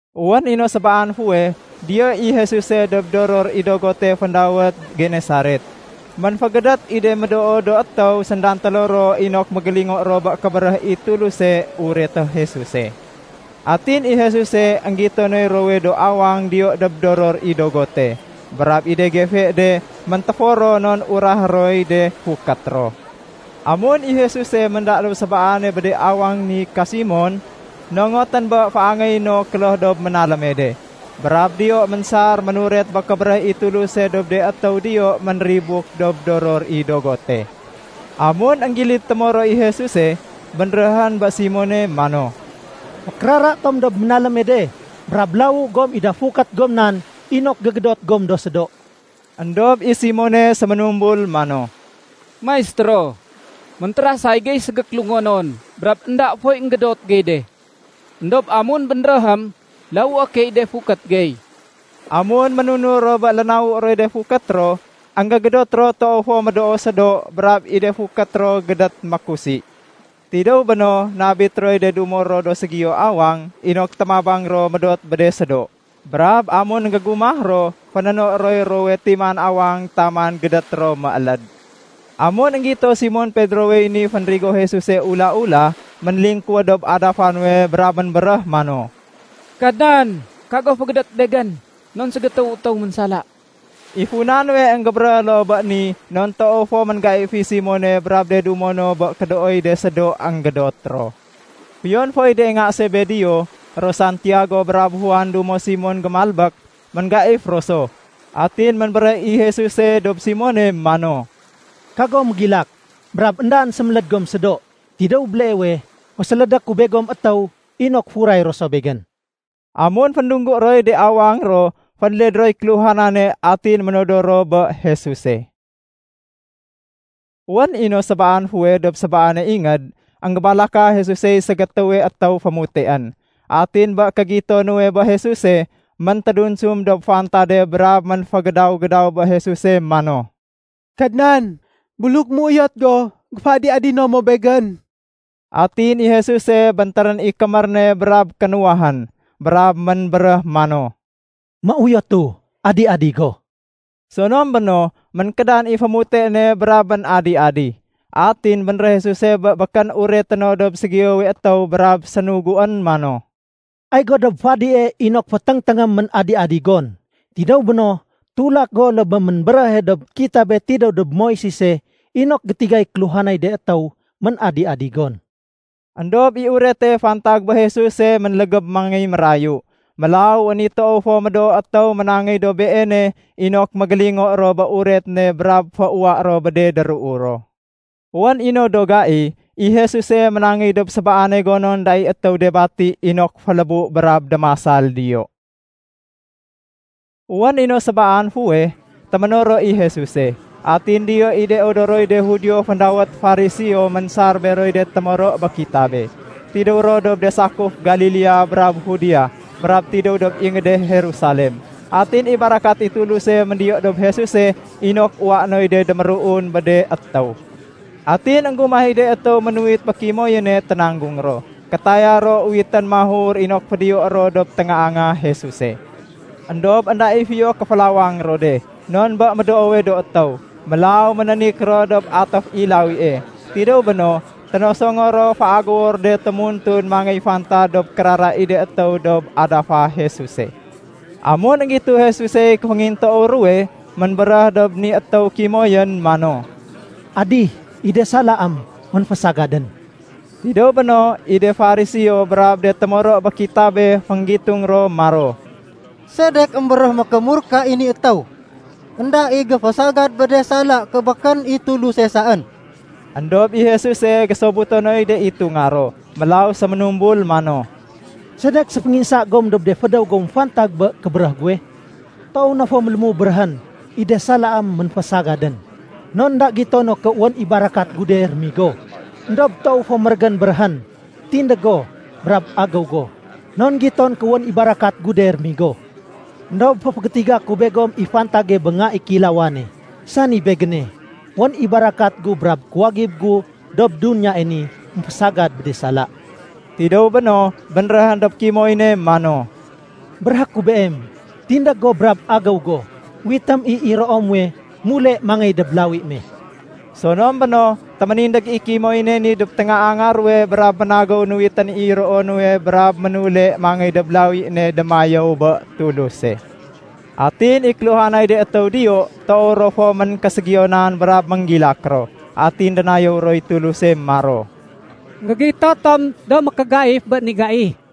Wén i no sébaan fuweh, diyo i Jesuse dob doror i dogote féndawét Genesaret. Ménfégédét i de médoo do étéw sédantélo ro inok mégélingo ro bé kébéréh i Tuluse ureté Jesuse. Atin i Jesuse énggito noy ruwowe do awang diyo dob doror i dogote. Brab i de gefe de méntéfor ro non urahé roy de fukét ro. Amun i Jesuse ménda dob sébaane bé de awang ni ka Simon, nongotén bé féangéyé no kloh dob ménaléme de. Brab diyo ménsar ménuret bé kébéréh i Tuluse dob de étéw diyo ménribuk dob doror i dogote. Amun énggilid témoro i Jesuse, bénréhén bé Simone mano, “Fékérara tom dob ménaléme de brab lawu gom i da fukét goma nan inok gégédot gom do sédo.” Endob i Simone séménumbul mano, “Maistéro, méntérasay gey ségékélungonon brab énda foy énggédot gey de. Endob amun bénréhém, lawué key de fukét gey.” Amun ménunur ro bé lénawu roy de fukét ro, énggégédot ro toow fo médoo sédo, brab i de fukét ro gédét mékusi. Tidéw béno, nabit roy de dumo ro dob ségiyowe awang, inok témabang ro médot bé de sédo. Brab amun énggégumah ro, fénéno roy ruwowe timan awang taman gédét ro mééléd. Amun énggito Simon Pedrowey ni fénrigo Jesuse ula-ula, ménlingkuwéd dob adafa nuwe brab ménbéréh mano, “Kadnan, kago fégédét begén, non ségétéwu étéw ménsala.” I funa nuwe énggébéréh loo bé ni non toow fo ménggaif i Simone brab de dumo no bé kédooy de sédo énggédot ro. Fiyon foy de nga Sebedeo, ro Santiago brab Juan dumo Simone gémalbék, ménggaif ro so. Atin ménbéréh i Jesuse dob Simone mano, “Kago mégilak. Brab éndaén séméléd gom sédo. Tidéw béleewe, fésélédé ku begom étéw inok furay ro so Begén.” Amun féndunggu roy de awang ro, fénled roy kéluhanane, atin ménodor ro bé Jesuse. Wén i no sébaan fuweh dob sébaane ingéd, énggébalaka Jesusey ségétéwe étéw fémuteén. Atin bé kégito nuwe bé Jesuse, méntédunsum dob fantade brab ménfégédaw-gédaw bé Jesuse mano, “Kadnan, buluk méuyot go, géféadi-adino mo begén.” Atin i Jesuse béntérén i kémér ne brab kénuwahén, brab ménbéréh mano, “Méuyotu. Adi-adi go!” Sonom béno, ménkédan i fémute ne brab ménadi-adi. Atin bénréh Jesuse bé békén ureté no dob ségiyowe étéw brab sénuguén mano, “Ay go dob fadie inok, féténgténgém i ménadi-adi gon. Tidéw béno, tulak go loo bé ménbéréhe dob Kitabé tidéw dob Moisese inok gétigay kéluhanay de étéw ménadi-adi gon.” Endob i urete fantag bé Jesuse ménlégéb mangéy mérayu. Mélaw wén i toow fo médoo étéw ménangéy dob Beene inok mégélingo ro bé uret ne brab féuwa ro bé de déruu ro. Wén i no do gai, i Jesuse ménangéy dob sébaane gonon énda i étéw de bati inok félébu brab démasal diyo. Wén i no sébaan fuweh, téménoro i Jesuse. Atin diyo i de odoroy de Judio féndawét Fariseo ménsar beroy de témoro bé kitabe. Tidéw ro dob de sakuf Galilea brab Judea brab tidéw dob ingéde Jerusalem. Atin i barakat i Tuluse méndiyo dob Jesuse inok uwaé noy de déméruun bé de étéw. Atin énggumah i de étéw ménuwit bé kimoyéne ténanggung ro. Kétaya ro uwitén mahur inok fédiyoé ro dob téngaanga Jesuse. Endob énda i fiyo kéfélawang ro de, non bé médoowe do étéw. Mélaw ménénik ro dob atéf i lawie. Tidéw béno, ténosongo ro féagéwo ro de témuntun mangéy fantad dob kérara i de étéw dob adafa Jesuse. Amun énggito Jesusey kéféngintoow ruwe, ménbéréh dob ni étéw kimoyén mano, “Adih, i de salaém ménfésagadén.” Tidéw béno, i de Fariseo brab de témoro bé kitabé fénggitung ro maro, “Sedek émbéréh mékémurka i ni étéw? Enda i géfésagad bé de sala ké békén i Tuluse saén!” Endob i Jesuse gésobuto noy de itunga ro. Mélaw séménumbul mano, “Sedek séfénginsa gom dob de fédéw gom fantag bé kébéréh guwe? Toow na fo mélému béréhén, ‘I de salaém ménfésagadén.’ Non énda gito no ké wén i barakat gu de rémigo. Endob toow fo mérégén béréhén, ‘Tindég go brab agéw go.’ Non giton ké wén i barakat gu de rémigo. Endob féfégétiga ku begom i fantage bé Nga i Kéilawane, sani Begéne. Wén i barakat gu brab kuwagib gu dob duniyae ni émfésagad bé de sala.” Tidéw béno, bénréhén dob kimoyéne mano, “Béréhé ku beem, tindég go brab agéw go uwitém i iroo muwe mule mangéy dob lawi me.” Sonom béno, téménindég i kimoyéne ni dob téngaanga ruwe brab ménagéw nuwitén i iroo nuwe brab ménule mangéy dob lawi ne démayéw bé Tuluse. Atin i kéluhanay de étéw diyo, toow ro fo ménkéségiyonan brab ménggilak ro. Atin dénayéw roy Tuluse maro, “Enggégito tom do mékégaif bé ni gai.”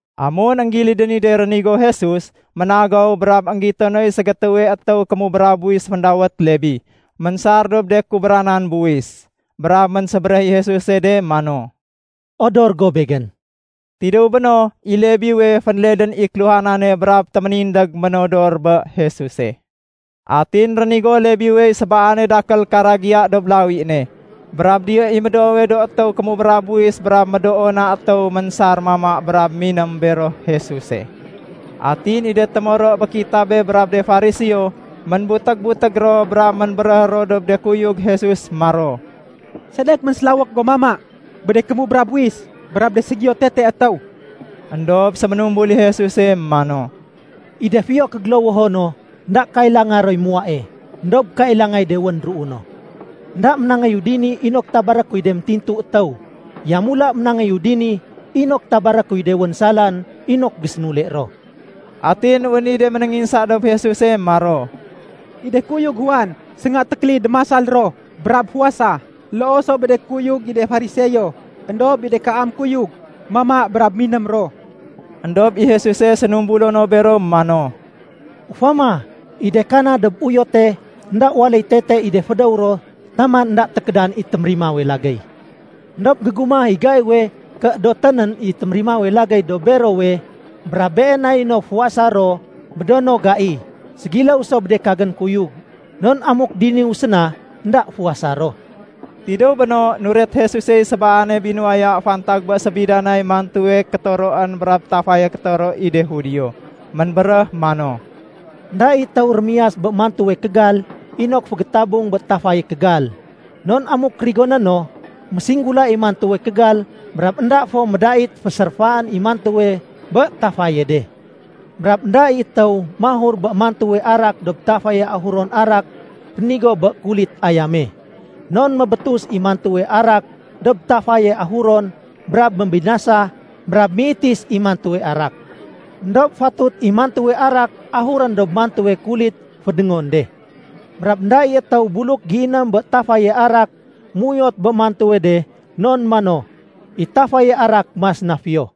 Amun énggilidén ni de rénigo Jesus, ménagéw brab énggito noy ségétéwe étéw kémubra buwis féndawét Lebi, ménsar dob de kubranan buwis. Brab ménsébéréh i Jesuse de mano, “Odor go Begén.” Tidéw béno, i Lebiwe fénledén i kéluhanane brab téménindég ménodor bé Jesuse. Atin rénigo Lebiwey sébaane dakél karagiya dob lawi ne. Brab diyo i médoowe do étéw kémubra buwis brab médoo na étéw ménsar mama brab miném bero Jesuse. Atin i de témoro bé kitabé brab de Fariseo, ménbutég-butég ro brab ménbéréh ro dob de kuyug Jesus maro, “Sedek ménsélawék gom mama bé de kémubra buwis brab de ségiyo tete étéw?” Endob séménumbul i Jesuse mano, “I de fiyo kégélowoho no, énda kailanga roy muwae, éndob kailangay de wén déruu no. Enda ménangéyu dini inok tabaré kuy de métintu étéw. Yamula ménangéyu dini inok tabaré kuy de wén salaén inok gésénule ro.” Atin wén i de ménénginsa dob Jesuse maro, “I de kuyug Juan sénga tékélid démasal ro brab fuwasa. Loo so bé de kuyug i de Fariseo. Endob i de kaam do kuyug mama brab miném ro.” Endob i Jesuse sénumbulo no bero mano, “Ufama, i de kana dob uyote énda waléy tete i de fédéw ro taman énda tékédan i témérimawe lagéy. Endob gégumah i gaiwe ké édotén nén i témérimawe lagéy dob berowe, brab been nay no fuwasa ro bé do no gai. Ségiléw so bé de kagén kuyug, non amuk diniwu séna, énda fuwasa ro.” Tidéw béno, nuret Jesusey sébaane binuwaya fantag bé sébidanay mantuwe kétoroén brab tafaye kétoro i de Judio. Ménbéréh mano, “Enda i étéw rémiyas bé mantuwe kégal inok fégétabung bé tafaye kégal. Non amuk rigoné no, mésinggula i mantuwe kégal, brab énda fo médait féséréfaén i mantuwe bé tafaye de. Brab énda i étéw mahur bé mantuwe arak dob tafaye ahuron arak rénigo bé kulit ayame, non mébétus i mantuwe arak dob tafaye ahuron brab mébinasa brab méitis i mantuwe arak. Endob fatut i mantuwe arak ahurén dob mantuwe kulit fédéngon de. Brab énda i étéw buluk géiném bé tafaye arak méuyot bé mantuwe de non mano, ‘I tafaye arak mas na fiyo.’”